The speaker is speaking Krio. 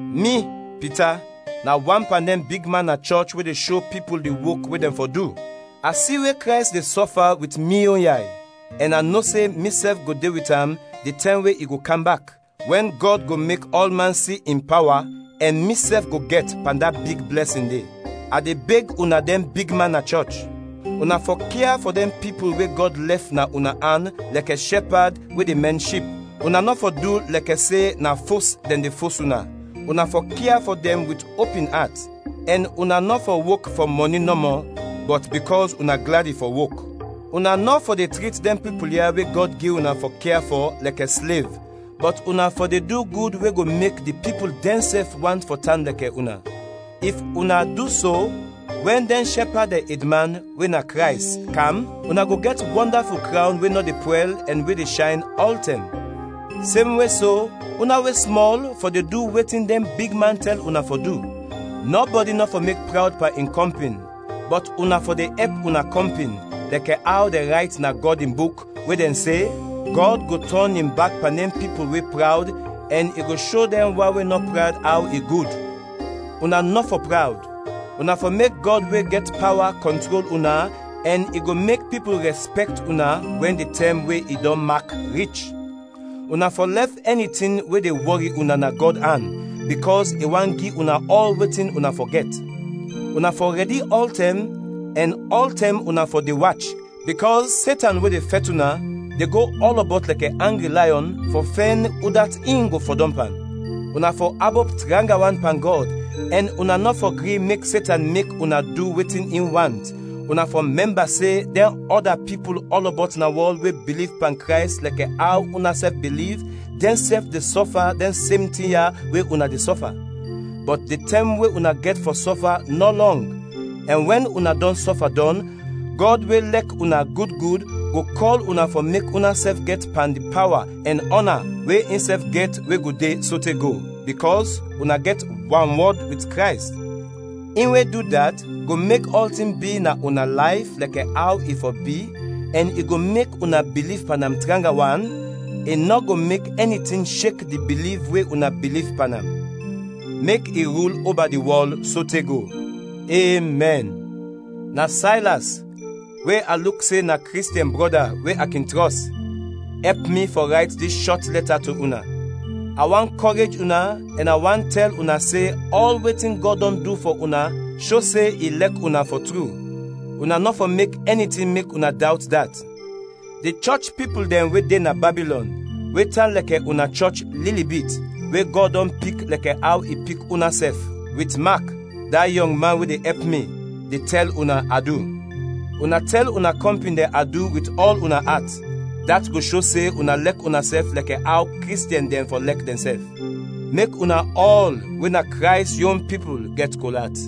Mi, Pita, na wan pan dɛn bigman na chɔch we de sho pipul di wok we dɛn fɔ du. A si we Krays de sɔfa wit mi yon yay, ɛn a no se misɛf go de wit am di tɛm we i go kam bak, wɛn Gɔd go mek ɔlman si in pawa ɛn misɛf go gɛt pan da big blɛsin de. A de beg una dɛn bigman na chɔch. Una fɔ kia fɔ dɛn pipul we Gɔd lɛf na una an lɛkɛ shɛpad we de mɛn ship. Una nɔ fɔ du lɛkɛ se na fos dɛn de fos una, una fɔ kia fɔ dɛn wit opin at; ɛn una nɔ fɔ wok fɔ mɔni nɔmɔ, bɔt bikɔs una gladi fɔ wok. Una nɔ fɔ de trit dɛn pipul ya we Gɔd gi una fɔ kia fɔ, lɛkɛ slev, bɔt una fɔ de du gud we go mek di pipul dɛnsɛf want fɔ tan lɛkɛ una. If una du so, wɛn dɛn shɛpad dɛn edman we na Krays, kam, una go gɛt wɔndaful krawn we nɔ de pwɛl ɛn we de shayn ɔltɛm. Semwe so, una we smɔl fɔ de du wetin dɛn bigman tɛl una fɔ du. Nɔbɔdi nɔ fɔ mek prawd pan in kɔmpin, bɔt una fɔ de ɛp una kɔmpin; lɛkɛ aw dɛn rayt na Gɔd in Buk, we dɛn se, “Gɔd go tɔn in bak pan dɛn pipul we prawd ɛn i go sho dɛn wan we nɔ prawd aw i gud.” Una nɔ fɔ prawd, una fɔ mek Gɔd we gɛt pawa kɔntrol una ɛn i go mek pipul rɛspɛkt una wɛn di tɛm we i dɔn mak, rich. Una fɔ lɛf ɛni tin we de wɔri una na Gɔd an, bikɔs i want gi una ɔl wetin una fɔ gɛt. Una fɔ rɛdi ɔltɛm, ɛn ɔltɛm una fɔ de wach, bikɔs Setan we de fɛt una, de go ɔlɔbɔt lɛkɛ angri layɔn, fɔ fɛn udat in go fɔdɔm pan. Una fɔ abop tranga wan pan Gɔd ɛn una nɔ fɔ gri mek Setan mek una du wetin in want, una fɔ mɛmba se dɛn ɔda pipul ɔlɔbɔt na wɔl we biliv pan Krays lɛkɛ aw unasɛf biliv, dɛnsɛf de sɔfa dɛn sem tin ya we una de sɔfa. Bɔt di tɛm we una gɛt fɔ sɔfa nɔ lɔng, ɛn wɛn una dɔn sɔfa dɔn, Gɔd we lɛk una gud gud, go kɔl una fɔ mek unasɛf gɛt pan di pawa ɛn ɔna we insɛf gɛt we go de sote go, bikɔs una gɛt wanwɔd wit Krays. In we du dat, go mek ɔltin bi na una layf lɛkɛ aw i fɔ bi ɛn i go mek una biliv pan am tranga wan, i nɔ go mek ɛni tin shek di biliv we una biliv pan am. Mek i rul oba di wɔl sote go! Emɛn. Na Saylas, we a luk se na Kristiɛn brɔda we a kin trɔs, ɛp mi fɔ rayt dis shɔt lɛta to una. A want kɔrej una ɛn a want tɛl una se ɔl wetin Gɔd dɔn du fɔ una sho se i lɛk una, fɔ tru; una nɔ fɔ mek ɛni tin mek una dawt dat. Di chɔch pipul dɛn we de na Babilɔn, we tan lɛkɛ una chɔch lili bit, we Gɔd dɔn pik lɛkɛ aw i pik unasɛf, wit Mak, da yɔng man we de ɛp mi, de tɛl una adu. Una tɛl una kɔmpin dɛn adu wit ɔl una at, dat go sho se una lɛk unasɛf lɛkɛ aw Kristiɛn dɛn fɔ lɛk dɛnsɛf. Mek una ɔl we na Krays yon pipul gɛt kol at.